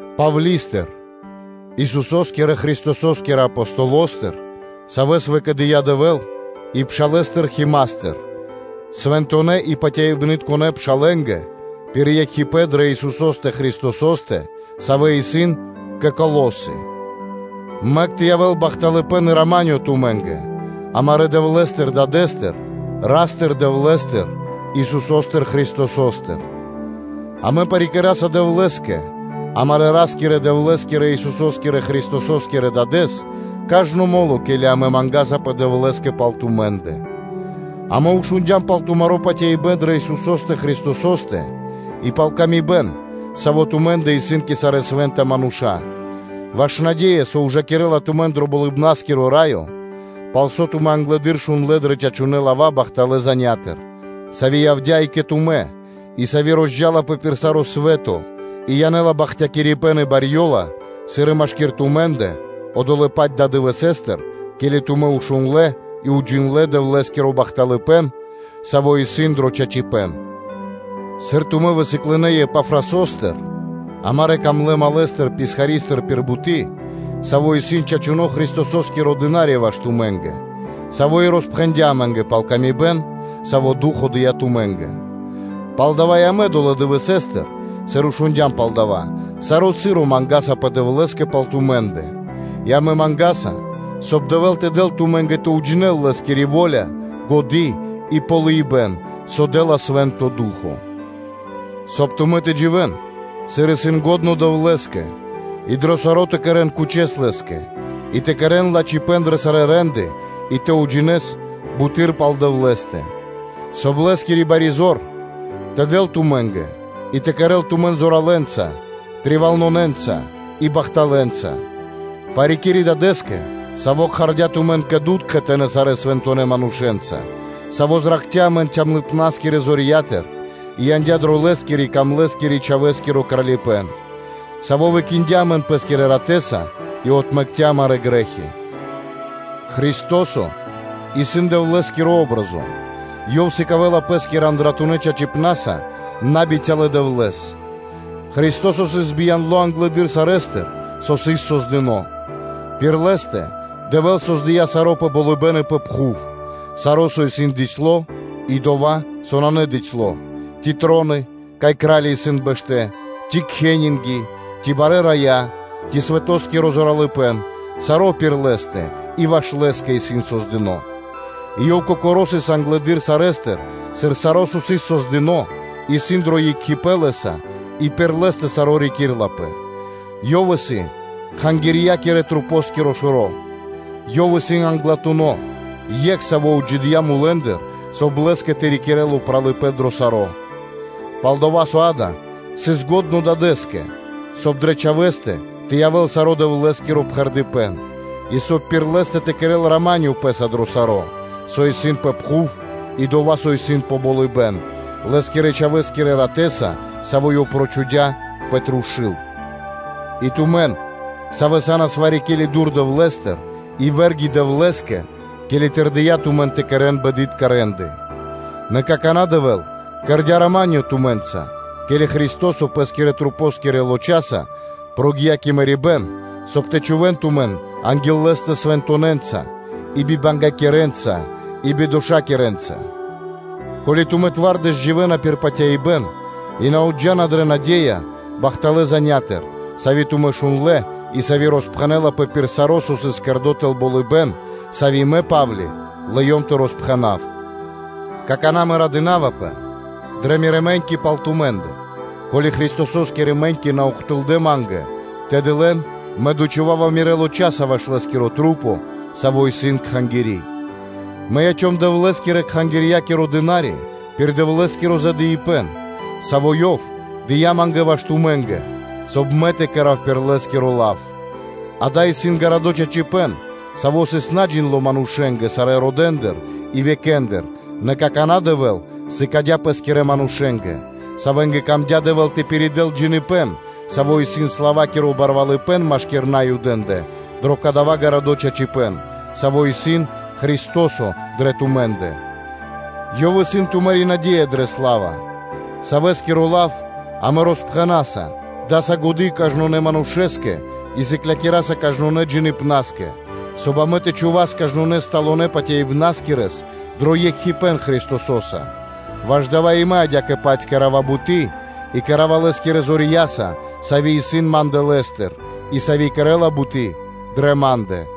Павли́стыр, Исусо́скирэ Христосо́скирэ Апостолостыр, савэ́с выкэдыя́ Дэвэ́л, и пшалэстыр Химастыр (Тимофеёстыр), свэнтонэ́ и патяибнытконэ пшалэ́нгэ пир екхипэ́н дрэ Исусо́стэ Христосо́стэ, савэ́ исын кэ Колосы. Мэк тэ явэ́л бахталыпэ́н и рама́нё (миро) тумэ́нгэ амарэ́ Дэвлэ́стыр-Дадэ́стыр; Ра́стыр-Дэвлэ́стыр, Исусо́стыр Христосостыр. Амэ парикираса Дэвлэ́скэ, амарэ́ Ра́скирэ-Дэвлэ́скирэ, Исусо́скирэ Христосо́скирэ Дадэ́с, кажно мо́ло, ке́ли амэ мангасапэ Дэвлэ́скэ пал тумэ́ндэ, амэ шундя́м пал тумаро́ патяибэ́н дрэ Исусо́стэ Христосо́стэ и пал паты́в кэ яви́р мануша́, сави́ тумэ́ндэ исын кэ сарэ́ свэ́нта мануша́, ваш наде́я, со ужакирэ́ла тумэн дро Болыбна́скиро Раё, пал со тумэ́ англэды́р шундлэ́ дрэ чачунэ́ лава́ бахталэ́ занятыр (звесятыр), сави́ явдя́ и кэ тумэ́ и сави́ розджалапэ пир саро́ свэ́то и янэ́ла бахтякирибэ́н и барьёла, сыр и машки́р тумэ́ндэ, долэ́-паць дывэсэ́стыр, ке́ли тумэ́ шундлэ́ и уджиндлэ́ Дэвлэ́скиро бахталыпэ́н, саво́ исын дро чачипэ́н; сыр тумэ́ высыклынэ Епафрасостыр, амарэ́ дрогонэ́ малэстыр-писхаристыр пир буты́, саво́ исын чачуно́ Христосо́скиро дына́ри (служытелё) ваш тумэ́нгэ, саво́ и роспхэндя́ амэ́нгэ пал паты́в кэ яви́р мануша́, сави́ Ду́хо (Фа́но) дыя́ тумэ́нгэ. Палдава́ и амэ долэ́ дывэсэ́стыр, сыр шундя́м пал дава́, саро́ часо мангасапэ Дэвлэ́скэ пал тумэ́ндэ, и амэ мангаса, соб (кай) Дэвэ́л тэ дэл тумэ́нгэ тэ уджинэл Лэ́скирэ во́ля, годы́ и ґалыибэ́н, со дэ́ла Свэ́нто Ду́хо (Фа́но). Соб (кай) тумэ́ тэ дживэ́н, сыр исын лачхо́ Дэвлэ́скэ, и дро саро́ тэ кэрэ́н кучэс Лэ́скэ, и тэ кэрэ́н лачхипэ́н дрэ сарэ́ рэ́нды и тэ уджинэс буты́р пал Дэвлэ́стэ, соб (кай) Лэ́скири бари зор тэ дэл тумэ́нгэ и тэ кэрэ́л тумэн зоралэнца, волякирэнца и бахталэнца, парикири́ Дадэ́скэ, Саво́ кхардя́ тумэн кэ дуд кхэтанэ́ сарэ́ свэнтонэ́ манушэ́нца, Саво́ зракхця́ амэн камлыпнаскирэ (цямлыпнаскирэ) зорья́тыр и яндя́ дро Лэ́скирэ-Дрогонэ́ Чхавэ́скиро Кралипэ́н: Саво́ выкиндя (выракхця) амэн Пэ́скирэ Ратэ́са и отмэкця́ амарэ́ грэ́хи; Христо́со исын Дэвлэ́скири патри́н (о́бразо). Ёв сыкавэ́ла Пэ́скирэ андратунэ́ чачипна́са набицялэ Дэвлэ́с. Христо́со сыс бияндло англэды́р сарэ́стыр, со сыс создыно́; пир Лэ́стэ Дэвэ́л создыя́ саро́ пэ болыбэ́н и пэ пхув, саро́, со исын дыцьло (бицяло́) и дова́, со нанэ дыцьло, ци троны, кай кра́лья исын бэштэ́, ци кхенинги, ци барэ́ рая, ци свэтоскиро зоралыпэ́н; саро́ пир Лэ́стэ и ваш Лэ́скэ исын создыно́. И Ёв Кокоро́ сыс англэды́р сарэ́стыр, сыр саро́, со сыс создыно́, исын дро екхипэ́н Лэ́са и пир Лэ́стэ саро́ рикирэ́лапэ. Ёв исын Кхангирья́кирэ – Духоскиро Шэро́, Ёв исын Англатуно́, Екх, Саво́ отджидыя́, соб (кай) Лэ́скэ тэ рикирэ́л упралыпэ́н дро саро́: пал-дова́ со дава́ сыс лачхо́ Дадэ́скэ, соб (кай) дрэ Чхавэ́стэ тэ явэ́л саро́ Дэвлэ́скиро пхэрдыпэн, и соб (кай) пир Лэ́стэ тэ кэрэ́л рама́нё (миро) Пэ́са дро саро́, со исын пэ пхув, и дова́, со исын пэ болыбэ́н, Лэ́скирэ-Чхавэ́скирэ ратэ́са, саво́ Ёв прочхудя пэ трушу́л. И тумэн, савэ́ са́нас вари-ке́ли дур Дэвлэ́стыр и вэ́рги Дэвлэ́скэ, ке́ли тырдыя тумэн тэ кэрэ́н бэдытка рэ́нды. Нэ какана́ Дэвэ́л кэрдя́ рама́нё (миро) тумэ́нца, ке́ли Христо́со Пэ́скирэ масэнгирэ лочаса прогия́ пир мэрибэ́н, соб (кай) тэ чхувэ́н тумэн анги́л Лэ́стэ свэнтонэнца, и бибангякирэнца и бидошакирэнца, ко́ли тумэ́ сан зоралэ́ дро ду́хо (фа́но) тэ дживэ́н пир патяибэ́н и на отджана дрэ наде́я бахталэ́ занятыр (звесятыр), сави́ тумэ́ шундлэ́, и сави́ роспхэнэлапэ пир саро́ джидо́, со сыс создыно́ тэл болыбэ́н, сави́ Мэ, Па́вли, лыём тэ роспхэнав. Какана́ мэ радынавапэ дрэ мирэ́ мэ́ньки пал тумэ́ндэ, ко́ли Христосо́скирэ мэ́ньки на ухтылдэ́ ма́нгэ, тэды лэн мэ дочхувава мирэ́ лочаса ваш Лэ́скирэ мэ́ньки Лэ́скирэ Масэнгэ, Савэ исын Кхангири́. Мэ яцём Дэвлэ́скирэ-кхангирья́киро дынариса пир Дэвлэ́скиро задыибэн, саво́ Ёв дыя́ ма́нгэ ваш тумэ́нгэ, соб (кай) мэ тэ кэра́в саро́ пир Лэ́скиро лав; дава́ исын гарадо́ чачипэ́н, саво́ сыс наджиндло манушэ́нгэ сарэ́ родэндыр и векэндыр, нэ какана́ Дэвэ́л сыкадя́ Пэ́скирэ манушэ́нгэ; савэ́нгэ камдя́ Дэвэ́л тэ пиридэл джиныбэ́н, саво́ исын славакиро барвалыпэ́н машки́р Наюдэ́ндэ дро кадава́ гарадо́ чачипэ́н, саво́ исын Христо́со дрэ тумэ́ндэ, Ёв исын тумари́ наде́я дрэ сла́ва: Савэскиро лав амэ роспхэнаса, амэ даса годы́ кажнонэ́ манушэ́скэ и сыклякираса кажнонэ́ джиныбнаскэ, соб (кай) амэ тэ чхувас кажнонэ́ сталонэ патяибнаскирэс дро екхипэ́н Христосо́са. Ваш дава́ и мэ адя́кэ-паць кэра́ва буты́ и кэра́ва Лэ́скирэ зорья́са, сави́ исын ма́ндэ Лэ́стыр, и сави́ кэрэ́ла буты́ дрэ ма́ндэ.